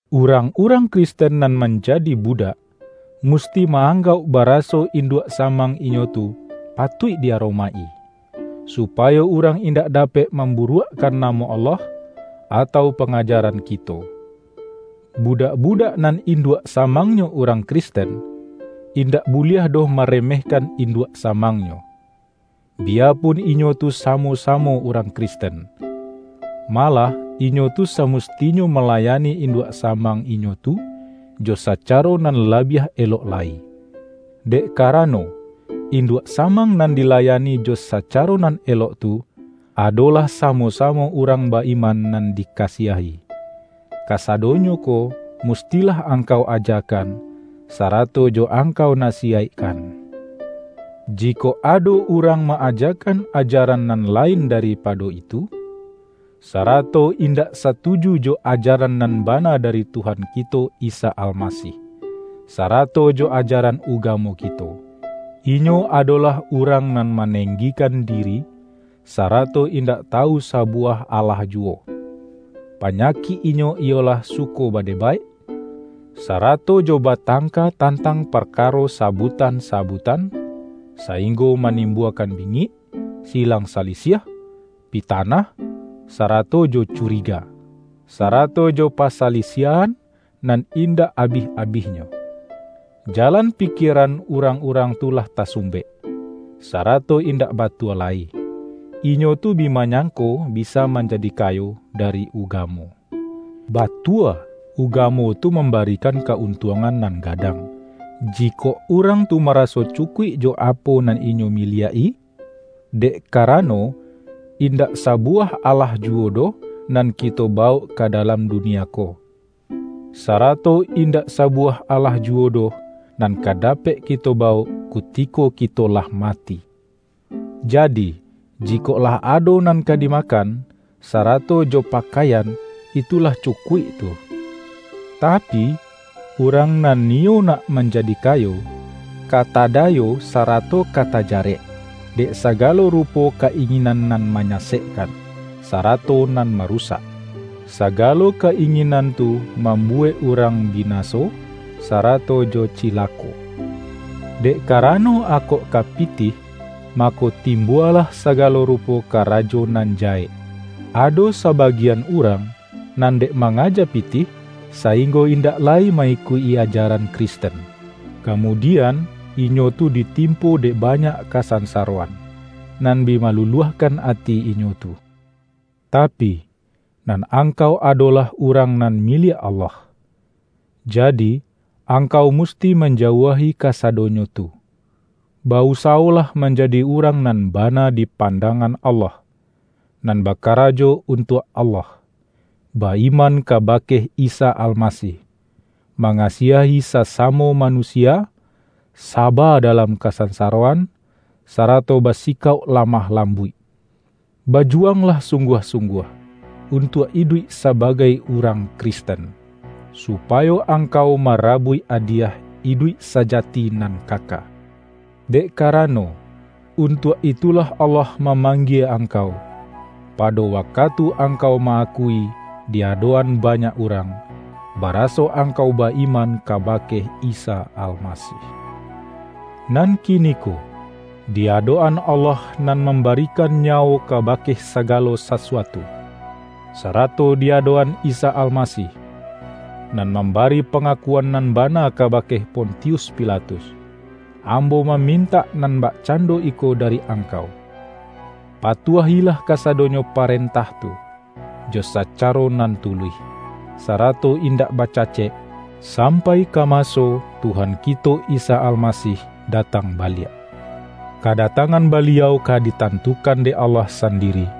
Urang-urang Kristen nan manja-di budak, musti ma-anggauk ba-raso induak samang inyo tu patuik di aromaik-i, supayo urang indak dapek mamburuakkan namo Allah, atau pa-ngajaran kito. Budak-budak nan in-duak samangnyo urang Kristen, in-dak buliah doh maremehkan induak samangnyo, biyapun inyo tu samo-sa-mo urang Kristen. Malah inyo tu sa-mustinyo malayani induak samang inyo tu, jo sacaro nan labiah elok lai, dek karano, induak samang nan di-layani jo sacaro nan elok tu, adolah samo-samo urang ba-iman nan dika-siahi. Kasadonyo ko mustilah angkau aja-kan, sarato jo angkau nasiyaikkan. Jikok ado urang ma-ajakan ajaran nan lain daripado itu, sarato indak satuju jo ajaran nan bana dari Tuhan kito Isa Almasih, sarato jo ajaran uga-mo kito, inyo adolah urang nan ma-nenggikan diri, sarato indak tawu sabuwah alah juwo! Panyakik inyo iyolah suko badebaik, sarato jo ba-tangka tantang parkaro sabutan-sa-butan, sainggo manimbuakan bingik, silang salisiah, pitanah, sarato jo curi-ga, sarato jo pasalisiahan nan indak abih-abihnyo. Jalan pikieran urang-urang tu lah tasumbek, sarato indak batua lai. Inyo tu bi manyangko bisa manjadi kayo dari ugamo. Batua, ugamo tu mambarikan ka-untuangan nan gadang, jikok urang tu maraso cukuik jo apo nan inyo mi-liak-i. Dek karano, indak sabuwah alah juwo doh, nan kito bawok ka da-lam dunia ko, sarato indak sabuwah alah juwo doh, nan ka dapek kito bawok, kutiko kito lah mati! Jadi, jikok lah ado nan ka dimakan, sarato jo pa-kaian, itu lah cukuik tu. Tapi, urang nan niyo nak manjadi kayo, ka tada-yo sarato ka tajarek, dek sagalo rupo ka-inginan nan manyasekkan, sara-to nan marusak. Sagalo ka-inginan tu mambuwek urang binaso, sarato jo ci-lako. Dek karano akok ka pitih, ma-ko timbualah sagalo rupo karajo nan jahek. Ado sabagian urang, nan dek mangaja pitih, sainggo indak lai ma-ikuik-i ajaran Kristen, kamudian inyo tu ditimpo dek banyak kasansaroan, nan bi maluluahkan ati inyo tu. Tapi, nan angkau adolah urang nan miliak Allah, jadi angkau musti manjauahi kasadonyo tu. Ba-usawo-lah manjadi urang nan bana di pan-dangan Allah, nan bakarajo untuak Allah, ba-iman kabake Isa Almasih, mangasiahi sasamo manusia, saba da-lam kasansaroan, sarato basikauk la-mah lambuik. Bajuwanglah sung-guah-sungguah, untuak iduik sabagai urang Kristen, supayo angkau mara-buik adiyah iduik sajati nan kaka. Dek karano, untuak itulah Allah mamang-gie angkau, pado wakatu angkau ma-akui di adok-an banyak urang, baraso angkau ba-iman kabake Isa Almasih. Nan kiniko, di adok-an Allah nan mambarikan nyawo kabake sagalo sa-suatu, sarato di adok-an Isa Almasih, nan mambari pangakuan nan bana kabake Pontius Pilatus, ambo mamin-tak nan bakcando iko dari angkau: Patuahilah kasadonyo parentah tu, jo sacaro nan tuluih, sarato indak ba-cacek, sampai ka maso Tuhan kito Isa Almasih datang baliak. Kadatangan Baliau ka ditantukan dek Allah sandi-ri,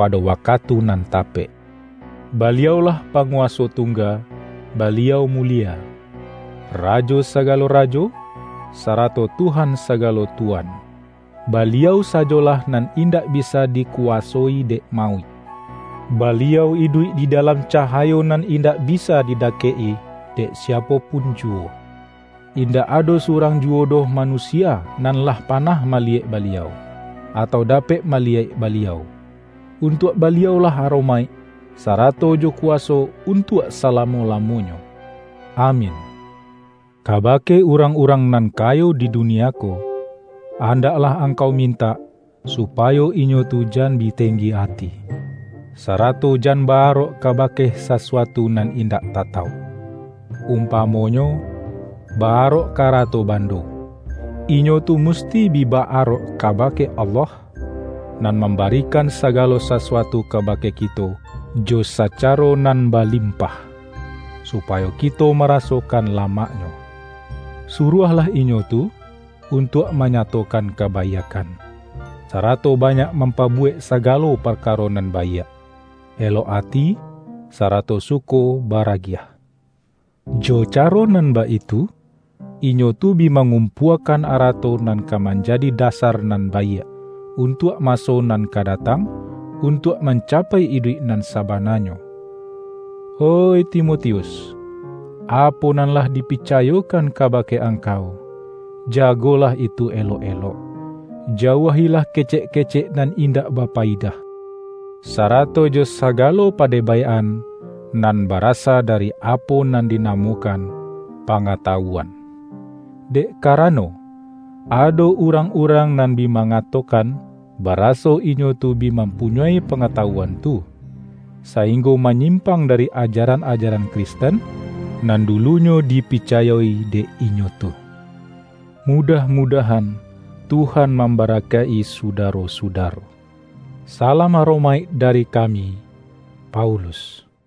pado wakatu nan tapek. Baliau-lah Panguwaso Tungga; Baliau mulie, Ra-jo sagalo rajo, sarato Tuhan sagalo tu-wan. Baliau sajolah nan indak bi-sa dikuwasoi dek mauik; Baliau iduik di dalam cahayo nan indak bisa di-dakek-i dek siapo pun juwo. Indak ado surang juwo doh manusia nan lah panah maliyek Baliau, atau da-pek maliyek Baliau. Untuak Baliau-lah aromaik, sarato jo kuwaso untuak salamo-lamonyo! Amin! Kabake urang-urang nan kayo di dunia ko, andaklah angkau mintak supayo inyo tu jan bi tenggi ati, sa-rato jan ba-arok kabake sasuatu nan indak tatauk — umpamonyo ba-arok ka arato bando. Inyo tu musti bi ba-arok kabake Allah, nan mambarikan sagalo sasuatu kabake kito jo sacaro nan balimpah, supayo kito marasokan lamaknyo. Saruahlah inyo tu, un-tuak manyatokan kabaiakkan, sarato banyak mampabuwek sagalo parkaro nan baiak, elok ati, sarato suko bara-giah. Jo caro nan baitu, inyo tu bi mangumpuakan arato nan ka manjadi dasar nan baiak, untuak maso nan ka datang, untuak mancapai iduik nan sabananyo. Oih Timotius! Apo nan lah dipica-yokan kabake angkau, jagolah itu elok-elok! Jauahilah kecek-kecek nan indak bapayidah, sarato jo sagalo padebaik-an, nan barasa dari apo nan dinamokan”Pa-ngatawuan”. Dek karano, ado urang-urang nan bi mangatokan, baraso inyo tu bi mampunyoi pangatawuan tu, sainggo manyimpang dari ajaran-ajaran Kristen, nan dulunyo dipicayo-i dek inyo tu. Mudah-mudahan Tuhan mambara-kaik-i sudaro-sudaro. Salam aromaik dari kami,Paulus.